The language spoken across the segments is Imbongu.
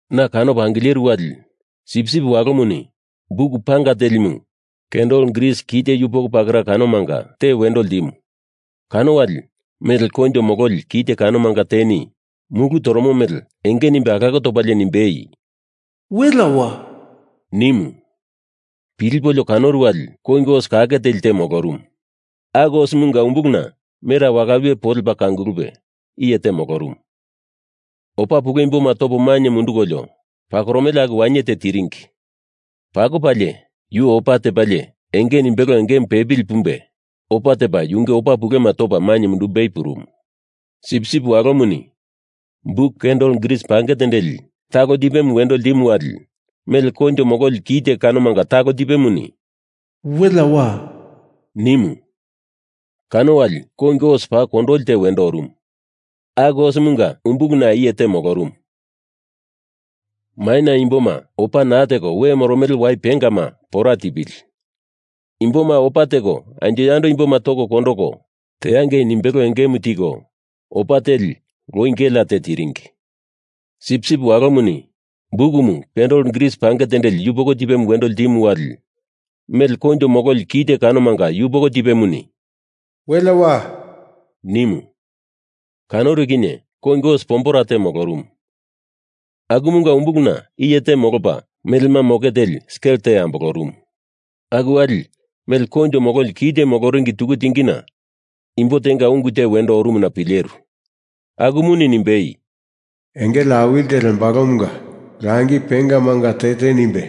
Na kanopo angileru wali Sipsip Walomuni buk panga telimu kandel gris kite yupoko pakera kanomanga te wendo ltimu, kano wali mele koinjo mololi kite kanomanga teni mulu toromo mele enge nimbe alako topalie nimbei, “Welea wa!” nimu. Pilipolio kanoru wali kongi os kake teli te molorumu. Aku osemunga umbuluna mera wala wiye po lepa kangulupe iye te molorumu. Opa pule imboma toko mainye mundukolio pakoromele aku wainye te tiringi. Pakopalie, yu opa tepalie enge nimbelo engemu pepili pumbe opa tepa yunge opa pulema topa mundumbei purumu. Sipsip Walomuni buk kandel gris pange tendeli talo tipemu wendo ltimu wali mele koinjo mololi kite kanomanga talo tipemuni “Welea wa!” nimu. Kano wali kongi os paa kondoli te wendo orumu, aku osemunga umbuluna iye te molorumu, Maina imboma opa naa teko we moromele wai pengama pora tipili! Imboma opa teko anjo yando imboma toko kondoko, teangei nimbelo engemu tiko, opa teli loi gelea te tiringi. Sipsip Walomuni bukumu kandel gris pange tendeli yupoko tipemu wendo ltimu wali mele koinjo mololi kite kanomanga yupoko tipemuni “Welea wa!” nimu. Kanoru kinye kongi os pombera te molorumu. Akumunga umbuluna iye te molopa melema moke teli skel te ambolorumu. Aku wali mele koinjo mololi kite moloringi tuku tingina imbo tenga ungu te wendo orumuna pileru, akumuni nimbei, “Engele awili te lembalomunga langi pengamanga te te nimbe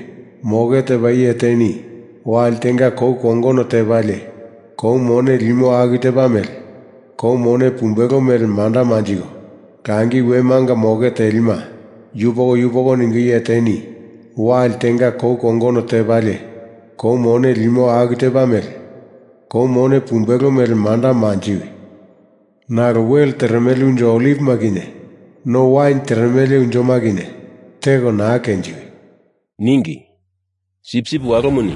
moke tepa iye teni wali tenga kou kongono tepalie kou mone limo aku tepa mele kou mone pumbelo mele manda manjiko, langi wemanga moke telima yupoko yupoko ningo iye teni wali tenga kou kongono tepalie kou mone limo aku tepa mele kou mone pumbelo mele manda manjiwi! Nalo wel teremele unjo olivima kinye no wain teremele unjoma kinye teko naa kenjiwi!” ningi. Sipsip Walomuni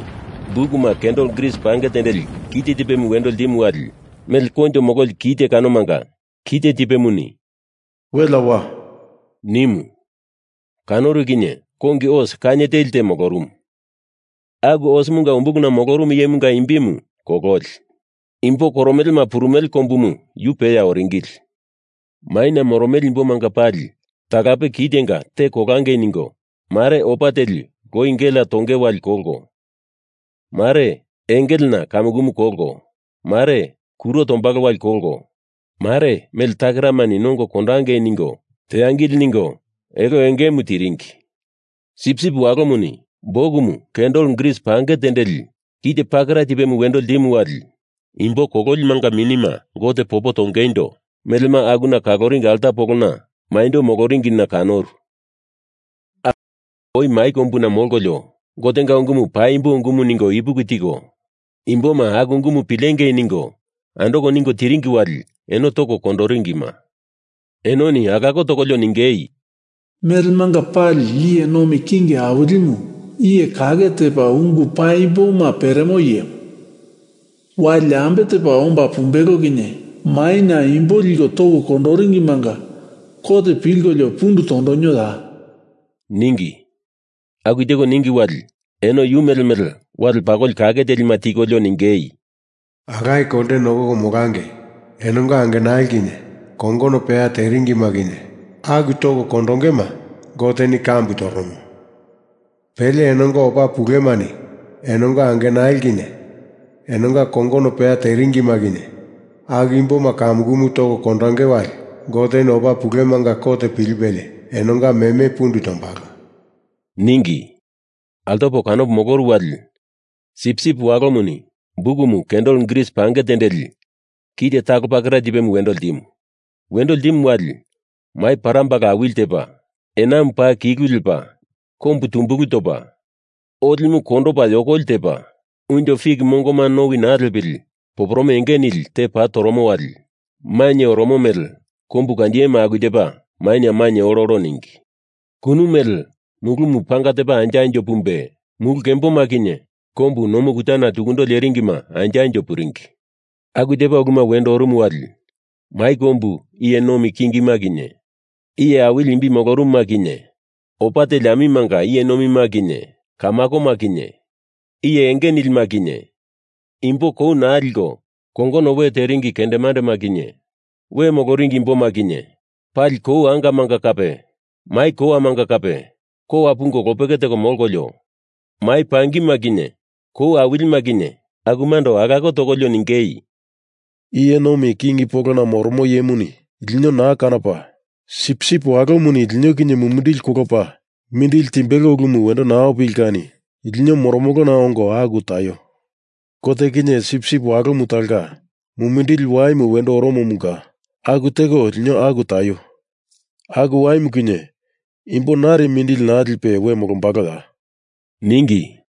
bukumu kandel gris pange tendeli kite tipemu wendo ltimu wali mele koinjo mololi kite kanomanga kite tipemuni “Welea wa!” nimu. Kanoru kinye kongi os kainye teli te molorumu. Aku osemunga umbuluna molorumu iyemunga imbimu Kololi. Imbo Koromelema Purumele Kombumu yu peya oringili. Maina moromele imbomanga pali talape kitenga te kolangei ningo Mare opa teli loi gelea tonge wali kolko, mare engelena kamukumu kolko, mare kuro tombalo wali kolko, mare mele takeramani nongo kondangei ningo teangili ningo elo engemu tiringi. Sipsip Walomuni bukumu kandel gris pange tendeli kite pakera tipemu wendo ltimu wali imbo kololimanga minima Gote popo tongeindo melema akuna kaloringi alta polona maindo moloringina kanoru. Aku imboma oi mai kombuna molkolio Gotenga ungumu paimbo ungumu ningo ipuki tiko, imboma aku ungumu pilengei ningo andoko ningo tiringi wali eno toko kondoringima, enoni alako tokolio ningei, “Melemanga Pali Iye Nomi King Awilimu, iye kake tepa ungu paimboma peremo iyemu, wali ambe tepa omba pumbelo kinye maina imbo lino toko kondoringimanga kot pilkolio pundu tondonioya?” ningi. Aku teko ningi wali eno yu mele mele wale pakoli kake telima tikolio ningei, “Alaye kolte nokoko molangei! Enonga angenali kinye kongono peya teringima kinye aku toko kondongema Goteni kambu toromo. Pele enonga opa pulemani enonga angenali kinye enonga kongono peya teringima kinye aku imboma kamukumu toko kondonge wali Goteni opa pulemanga kot pilipelie enonga meme pundu tondombalo,” ningi. Altopo kanopo moloru wali Sipsip Walomuni bukumu kandel gris pange tendeli kite talo pakera tipemu wendo ltimu. Wendo ltimu wali mai parambala awili tepa, enamu paa kilu lepa kombu tumbulu topa, olimu kondopa yokoli tepa, unjo fik mongoma nowi naa lepili poporome enge nili tepa toromo wali mainye oromo mele kombu kandiyema aku tepa maina mainye ololo ningi. Kunu mele mulumu panga tepa anjo anjo pumbe, mulu kemboma kinye kombu nomu kutana tukundo lerimuma anjo anjo puringi. Aku tepa uluma wendo orumu wali mai kombu iye nomi kingima kinye iye awili imbi molorumuma kinye opa teli amimanga iye nomima kinye kamakoma kinye iye enge nilima kinye imbo kou naa liko kongono we teringi kendemandema kinye we moloringi imboma kinye pali kou angamanga kape mai kowamanga kape kowa pungo lopeke teko molkolio, mai pangima kinye kou awilima kinye akumando alako tokolio ningei, “Iye nomi king polona moromo iyemuni lino naa kanopa, Sipsip Walomuni lino kinye mumindili kolopa mindili timbelo ulumu wendo naa opili kani lino moromolona ongo aku taio! Gote kinye Sipsip Walomu talonga mumindili waimu wendo oromomunga aku teko lino aku taio! Aku waimu kinye imbo nari mindili naa lipe we molombaloya?” ningi.